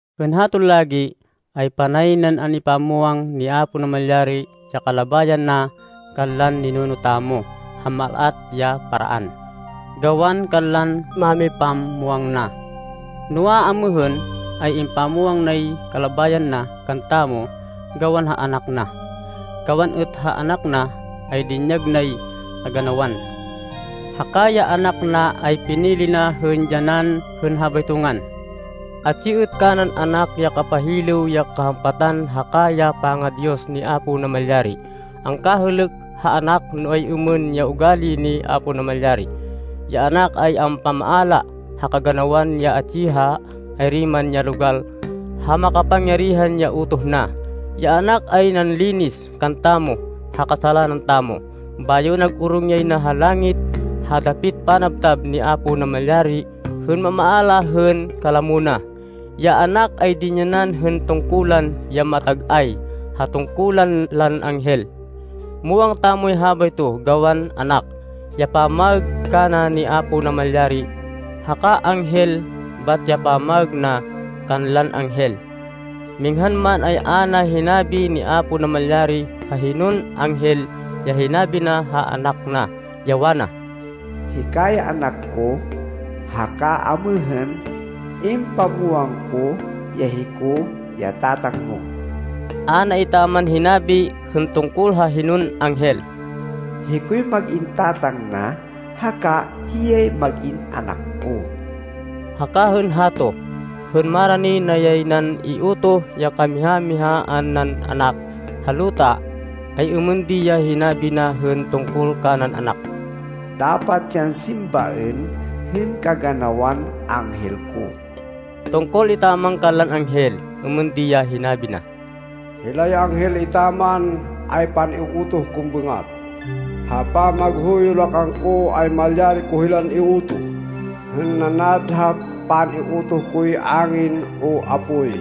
Hên haton lagi, ay panay nan an-ipamwang ni Apo Namalyari ya kalabayan na kanlan ninuno tamo ha mal-at ya paraan, gawan kanlan mámipamwang na. Noa, amêhên, ay impamwang nay kalabayan na kantamo gawan ha Anak na. Gawan êt ha Anak na ay dinyag nay kaganawan. Haka ya Anak na ay pinili na hên dyanan hên habayto ngan. Atsi êt kanan Anak ya kapahilêw ya kahampatan haka ya panga-Diyos ni Apo Namalyari. Angkahêlêk ha Anak no ay-êmên ya ugali ni Apo Namalyari. Ya Anak ay ampamaala ha kaganawan ya atsi ha ayri man ya logal ha makapangyarihan ya utoh na. Ya Anak ay nanlinis kantamo ha kasalanan tamo, bayo nag-orong yay na ha langit ha dapit panabtab ni Apo Namalyari hên mamaala hên kalamo na. Ya Anak ay dinyanan hên tungkulan ya matag-ay ha tungkulan lan anghel. Muwang tamoy habayto gawan “Anak” ya pamaêg kana ni Apo Namalyari, haka “anghel” bat ya pamaêg na kanlan anghel. Minghan man, ay a na hinabi ni Apo Namalyari ha hinon anghel ya hinabi na ha Anak na, ya wana, “Hika ya Anak ko, haka amêhên impamwang ko ya hiko ya Tatang mo!” A na etaman hinabi hên tungkol ha hinon anghel, “Hikoy mag-in Tatang na, haka hiyay mag-in Anak ko.” Haka hên hato, hên marani na yay nan iutoh ya kamiha-mihaan nan Anak ha luta, ay êmên di ya hinabi na hên tungkol kanan Anak, “Dapat yan simbaên hên kaganawan anghel ko.” Tungkol etaman kanlan anghel, êmên di ya hinabi na, “Hilay anghel etaman ay pan-iutoh kon bêngat. Ha pamaghuyo la kangko ay malyari ko hilan iutoh hên nanad ha pan-iutoh koy angin o apoy.”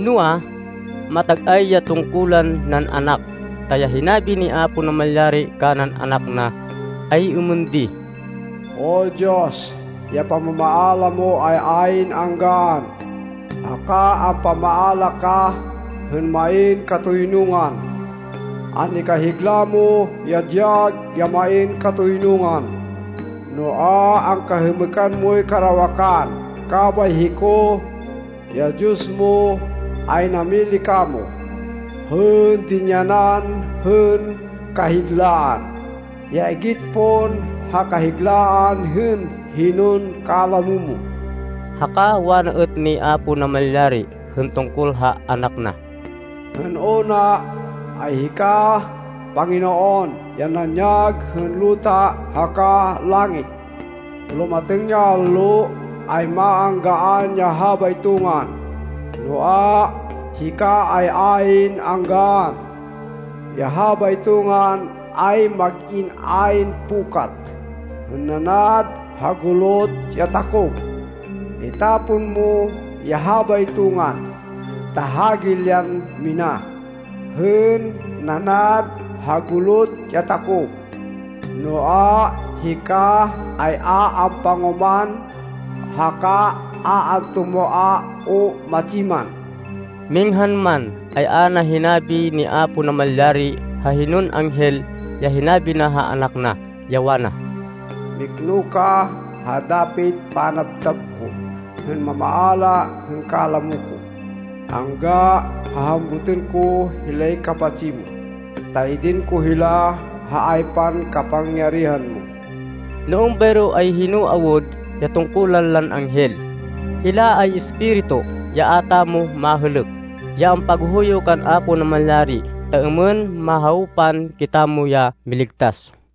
Noa, matag-ay ya tungkulan nan Anak, ta ya hinabi ni Apo Namalyari kanan Anak na, ay êmên di, “O Diyos, ya pamamaala mo ay ayn anggaan, haka ampamaala ka, hên main katoynungan. An-ikahigla mo ya dyag ya main katoynungan, noa, angkahêmêkan moy karawakan, kabay hiko, ya Diyos mo, ay namili kamo, hên dinyanan hên kahiglaan, ya igit pon ha kahiglaan hên hinon kalamo mo.” Haka wana êt ni Apo Namalyari hên tungkol ha Anak na, “Hên una, ay hika Panginoon ya nanyag hên luta haka langit. Lumatêng ya allo, ay maanggaan ya habayto ngan, noa, hika ay ayn anggaan. Ya habayto ngan ay mag-in ayn pukat hên nanad ha gulot ya takop. Itapon mo ya habayto ngan ta hagilyan mina, hên nanad ha gulot ya takop. Noa, hika ay a ampangoman, haka a antumoa o matsi man.” Minghan man, ay a na hinabi ni Apo Namalyari ha hinon anghel ya hinabi na ha Anak na, ya wana, “Mikno ka ha dapit panabtab ko hên mamaala hên kalamo ko, angga ha hambutên ko hilay kapatsi mo, ta idin ko hila ha aypan kapangyarihan mo.” No êmbayro ay hino awud ya tungkulan lan anghel? Hila ay espiritu, ya a tamo mahêlêk, ya ampaghuyo kan Apo Namalyari, ta êmên mahawpan kitamo ya miligtas.